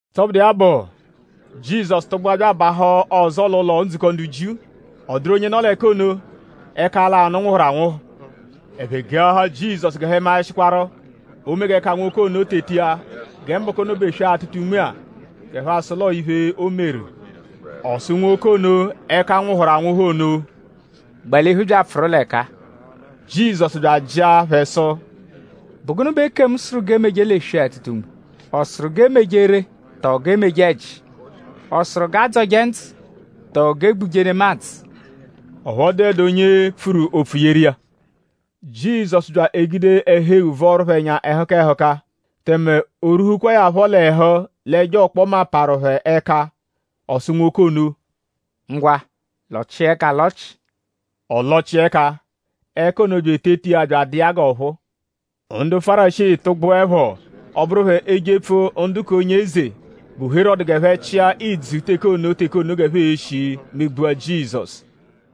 Tọbudu iya bụ; Jizọsu tụgbua bya abahụ ọzo l'ụlo-ndzukọ ndu Jiu. Ọ dụru onye nọ l'ẹka ono, ẹka lanụ nwụhuru anwụhu. Ẹphe geahaa Jizọsu g'ẹphe maẹshikwaru:?oo-me g'ẹka nwoke ono teta iya gẹ mbọku ono bụ eswe-atụta-unme-a; g'ẹphe asụ l'o noo iphe, o meru. Ọ sụ nwoke ono, ẹka nwụhuru anwụhu ono: “Gbalihu bya apfụru l'ẹka-a.” Jizọsu bya ajịa phẹ sụ: “?Bụ gụnu bẹ ekemu sụru g'emeje l'eswe-atụta-unme??Ọ sụru g'e meje ree tọo g'e meje ẹji??Ọ sụru g'a dzọje ndzụ tọo g'e gbuje nemadzụ?” Ọphu ọ dụdu onye pfuru opfu yeru iya. Jizọsu bya egude ẹhu-eghu vọoru phẹ ẹnya ẹhuka ẹhuka; tẹme o rwuhukwaa ya phọ l'ẹhu l'ẹjo-ọkpoma parụ phẹ ẹka. Ọ sụ nwoke ono: “Ngwa; lọchia ẹka alọchi!” Ọ lọchia ẹka. Ẹka ono bya eteta iya bya adụ iya g'ọphuu. Ndu Fárisii tụgbuepho; ọ bụru phẹ ejepfu ndu k'onye eze, bụ Herọdu g'ẹphe chịa ìdzù teke ono teke ono g'ẹphe e-shi megbua Jizọsu.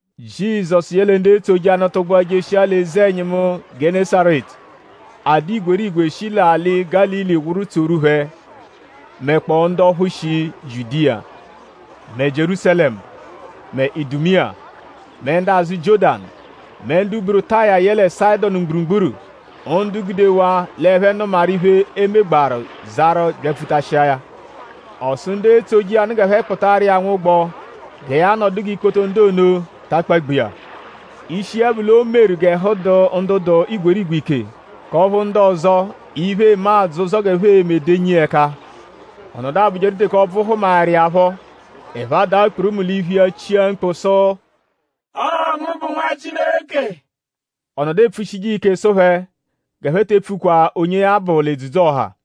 Jizọsu yẹle ndu etsoje iya nụ tụgbua jeshia l'eze-ẹnyimu Gẹnesaretu. A dụ igwerigwe shi l'alị Gálili wụru tsoru phẹ; mẹkpoo ndu ọphu shi Jiudiya; mẹ Jierúsalẹmu; mẹ ndu Idumiya; mẹ ndu azụ Jiọ́danu; mẹ ndu buru Taya yẹle Sayịdonu mgburugburu; ndu gudewaa l'ẹphe nụmaru iphe, o megbaaru zarụ byapfutashia ya. Ọ sụ ndu etsoje iya nụ g'ẹphe kpụtaru iya nwụgbo gẹ ya nọdu g'ikpoto ndu ono ta akpagbu iya. Ishi iya bụ l'o meru g'ẹhu dụ ndu dụ igwerigwe ike; k'ọphu ndu ọzo, iphe eme adzọ ụzo g'ẹphe e-me denyi iya ẹka. Ọ nọdu abụjeru teke ọbvu hụmaeru iya phọ; ẹphe adaa kpurumu l'iphu iya chia mkpu sụ: “Ọo ngu bụ Nwa Chileke.” Ọ nọdu epfushije iya ike sụ phẹ g'ẹphe te epfukwa onye ya bụ l'edzudzu-ọha.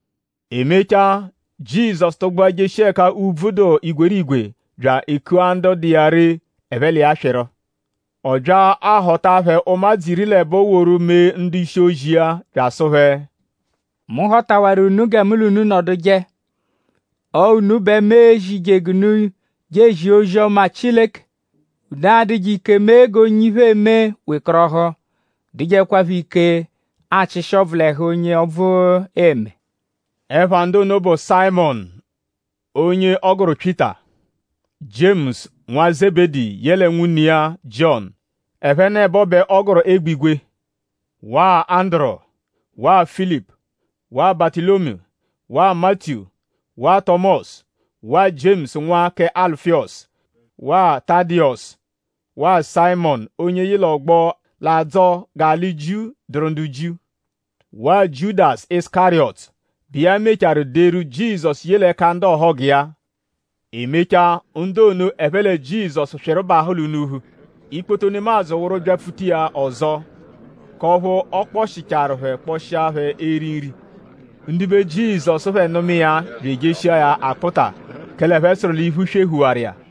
E mechaa; Jizọsu tụgbua jeshia ẹka úbvú dụ igwerigwe bya ekua ndu dụ iya ree; ẹphe l'iya swịru. Ọ bya ahọta phẹ ụmadzu iri l'ẹbo woru mee ndu-ishi-ozi iya bya asụ phẹ: “Mu họtawaru unu gẹ mu l'unu nọduje. Ọo unu bẹ mu e-zije g'unu je ezia ozi-ọma Chileke; unu adụje ike mee g'onye iphe eme wekọrohu; dụjekwapho ike achịshi ọbvu l'ẹhu onye ọbvu eme.” Ẹpha ndu ono bụ: Sayịmonu onye ọ gụru Pyịta. Jiemusu nwa Zebedi yẹle nwune iya Jiọnu. Ẹphenebo bẹ ọ gụru Egbigwe; waa Anduru; waa Filipu; waa Batụlomiyu; waa Matiyu; waa Tọmosu; waa Jiemusu nwa kẹ Alufiyọsu; waa Tadiyọsu; waa Sayịmonu onye yị l'ọgbo, l'adzọ g'alị Jiu dụru ndu Jiu; waa Jiudasu Isukariyọtu, bụ iya mechaarụ deru Jizọsu ye l'ẹka ndu ọhogu iya. E mechaa; ndu ono ẹphe lẹ Jizọsu swịru bahụ l'unuphu. Ikpoto nemadzụ wụru byapfuta iya ọzo; k'ọphu ọ kpọshicharu phẹ kpọshia phẹ eri nri. Ndibe Jizọsu phẹ nụma iya bya ejeshia ya akpụta; kẹle ẹphe sụru l'iphu swehuwaru iya.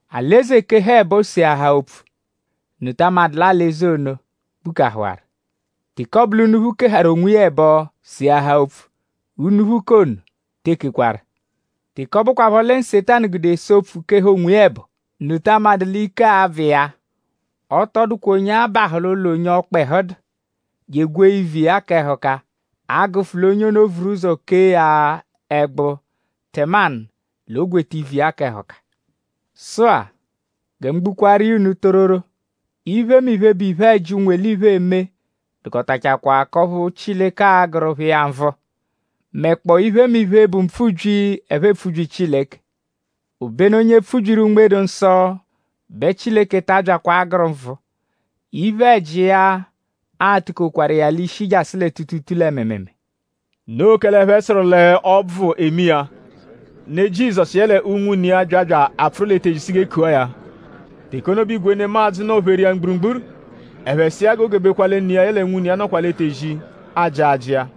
Alị-eze -keha ẹbo seahaa opfu;?unu ta amadụ l'alị-eze ono gbukahụwaru? Teke ọbu l'unuphu keharu onwiya ẹbo seahaa opfu; unuphu k'ono tee kekwaru. Teke ọ bụkwapho lẹ Nsetanu gude ese opfu; keha onwiya ẹbo;?unu ta amadụ l'ike a-bvụ iya? “Ọ tọ dụkwa onye a-bahụ l'ụlo onye ọkpehu dụ; je egwee ivu iya kẹ ẹhuka; a -gụfu l'onye ono vuru ụzo kee ya ẹgbu tẹmanu l'o gweta ivu iya kẹ ẹhuka. “Sụ-a; gẹ mu gbuaru iya unu tororo; iphemiphe, bụ iphe-ẹji, ụnwu-eliphe eme dụkotachakwaa k'ọphu Chileke a-gụru phẹ iya nvụ; mẹkpoo iphemiphe, bụ mpfubyi, ẹphe epfubyi Chileke. Obenu onye pfubyiru Unme-dụ-Nsọ bẹ Chileke ta abyakwa agụru nvụ. Iphe-ẹji iya a-tukokwaru iya l'ishi jasụ lẹ tuutuutuu lẹ mịimiimii.” Noo kẹle ẹphe sụru l'ọbvu eme iya. Ne Jizọsu yẹle unwune iya bya bya apfụru l'etezi zia sụ g'e kua ya. Teke ono bẹ igwe nemadzụ nọ-pheru iya mgburugburu. Ẹphe sụ iya g'o gebekwa lẹ ne iya yẹe unwune iya nọkwa l'etezi ajị ajị iya.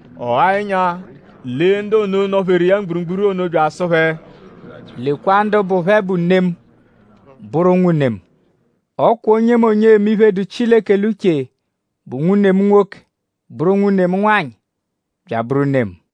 Ọ ghaa ẹnya; lee ndu ono, nọ-pheru iya mgburugburu ono bya asụ phẹ: “Lekwa ndu bụ phẹ bụ ne mu; bụru unwune mu! Ọ kwa onyemonye, eme iphe, dụ Chileke l'uche bụ nwune mu nwoke; bụru nwune mu nwanyị; bya abụru ne mu.”